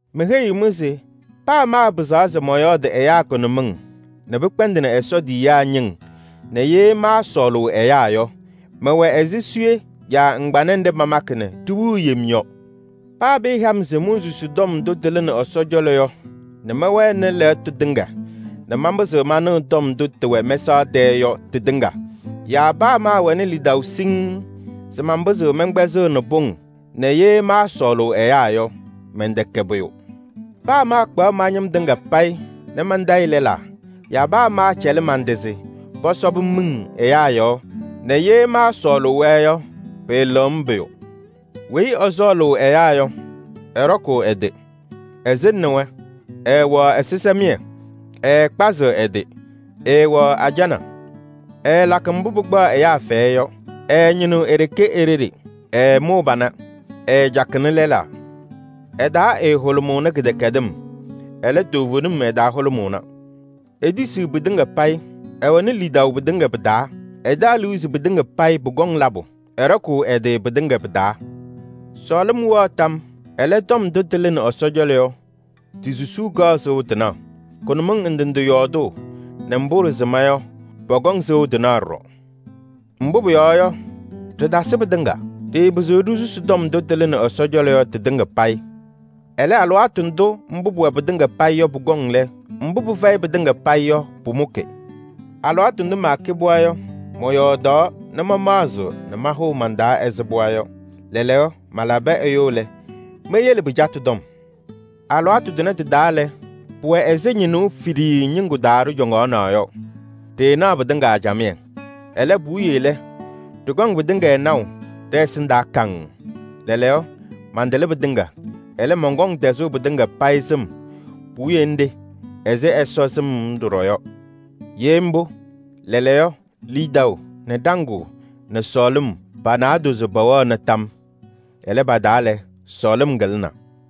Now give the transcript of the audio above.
Meheyiɣ-mɩ se: paa maapɩzaɣ se mɔyɔɔdɩ ɛyaa kʋnʋmɩŋ nɛ pɩkpɛndɩnɩ Ɛsɔ tiyiyaa ñɩŋ nɛ ye maasɔɔlʋʋ ɛyaa yɔ, mɛwɛ ɛzɩ suye yaa ŋgbanɛ nɖɩ pamakɩ nɛ ɖiwiɣ yem yɔ. Paa pɩɩha-m se monsusi tɔm ndʋ tɩlɩnɩ Ɛsɔ cɔlɔ yɔ nɛ mɛwɛnɩ lɛɣtʋ tɩŋa nɛ manpɩzɩɣ manɩɣ tɔm ndʋ tɩwɛ mɛsaɣ tɛɛ yɔ tɩtɩŋa yaa paa maawɛnɩ lidaʋ siŋŋ se manpɩzɩɣ mɛnkpɛzɩɣnɩ pʋŋ nɛ ye maasɔɔlʋʋ ɛyaa yɔ, mɛntɛkɛ pʋyʋ. Paa maakpaɣ ma-ñɩm tɩŋa payɩ nɛ mantayɩ lɛlaa yaa paa maacɛlɩ man-tɩ se pɔsɔbɩ-m miŋ ɛyaa yɔɔ nɛ ye maasɔɔlʋʋ-wɛ yɔ, pɩɩlɩɣ-m pʋyʋ. Weyi ɛsɔɔlʋʋ ɛyaa yɔ, ɛɖɔkʋʋ ɛ-tɩ, ɛsɩŋnɩ-wɛ, ɛɛwɛɣ ɛzɩsɛmɩyɛ. Ɛɛkpazɩɣ ɛ-tɩ, ɛɛwɛɣ ajana. Ɛɛlakɩ mbʋ pɩkpaɣ ɛyaa fɛyɛ yɔ, ɛɛñɩnɩɣ e-ɖeɖe, ɛɛmʋʋ pana, ɛɛcakɩnɩ lɛlaa. Ɛ-taa ɛɛhʋlʋmʋʋnɩ kɩdɛkɛdɩm, ɛlɛ, toovenim ɛ-taa hʋlʋmʋʋna. Etisiɣ pɩtɩŋa payɩ, ɛwɛnɩ lidaʋ pɩtɩŋa pɩ-taa, ɛtaɣ liu se pɩtɩŋa payɩ pʋkɔŋ labʋ, ɛɖɔkʋʋ ɛ-tɩ pɩtɩŋa pɩ-taa. Sɔɔlɩm wɛɣ tam yɔɔ, ɛlɛ, tɔm ndʋ tɩlɩnɩ Ɛsɔ cɔlɔ yɔ ti-susuu kaɣ sɩʋ tɩnaɣ. Kʋnʋmɩŋ ndɩ ndɩ yɔɔdʋʋ nɛ mbʋ ɖɩsɩma yɔ, pɔkɔŋ sɩʋ tɩnaɣ ɖɔɖɔ. Mbʋ pʋyɔɔ yɔ, ɖɩtasɩ pɩtɩŋa. Ɖɩɩpɩzɩɣ ɖisusi tɔm ndʋ tɩlɩnɩ Ɛsɔ cɔlɔ yɔ tɩtɩŋa payɩ. Ɛlɛ, alɩwaatʋ ndʋ mbʋ pʋwɛ pɩtɩŋa payɩ yɔ pʋkɔŋ lɛ, mbʋ pɩfɛyɩ pɩtɩŋa payɩ yɔ pʋmʋkɩ. Alɩwaatʋ ndʋ maakɛ pɩɣa yɔ, mɔyɔɔdaɣ nɛ mamaɣzɩɣ nɛ mahʋʋ man-taa ɛzɩ pɩɣa yɔ. Lɛɛlɛɛyɔ malabɩ ɛyʋ lɛ, meyele pɩcatʋ tɔm. Alɩwaatʋ tʋnɛ tɩ-taa lɛ, pʋwɛ ɛzɩ ñɩnʋʋ fiɖiyii ñɩŋgʋ taa ɖɩcɔŋna yɔ, ɖɩɩnaɣ pɩtɩŋa camɩyɛ. Ɛlɛ puwiye lɛ, ɖɩkɔŋ pɩtɩŋa naʋ ɖɛ-ɛsɩndaa kaŋŋ. Lɛɛlɛɛyɔ mantatɩlɩ pɩtɩŋa, ɛlɛ, mɔnkɔŋ tɛzʋʋ pɩtɩŋa payɩ sɩm puwiye nɖɩ ɛzɩ Ɛsɔ sɩm-m ɖɔɖɔ yɔ. Ye mbʋ, lɛɛlɛɛyɔ lidaʋ nɛ ɖaŋʋʋ nɛ sɔɔlɩm pa-naadozo pɛwɛɣna tam. Ɛlɛ, pa-taa lɛ, sɔɔlɩm kɩlɩna.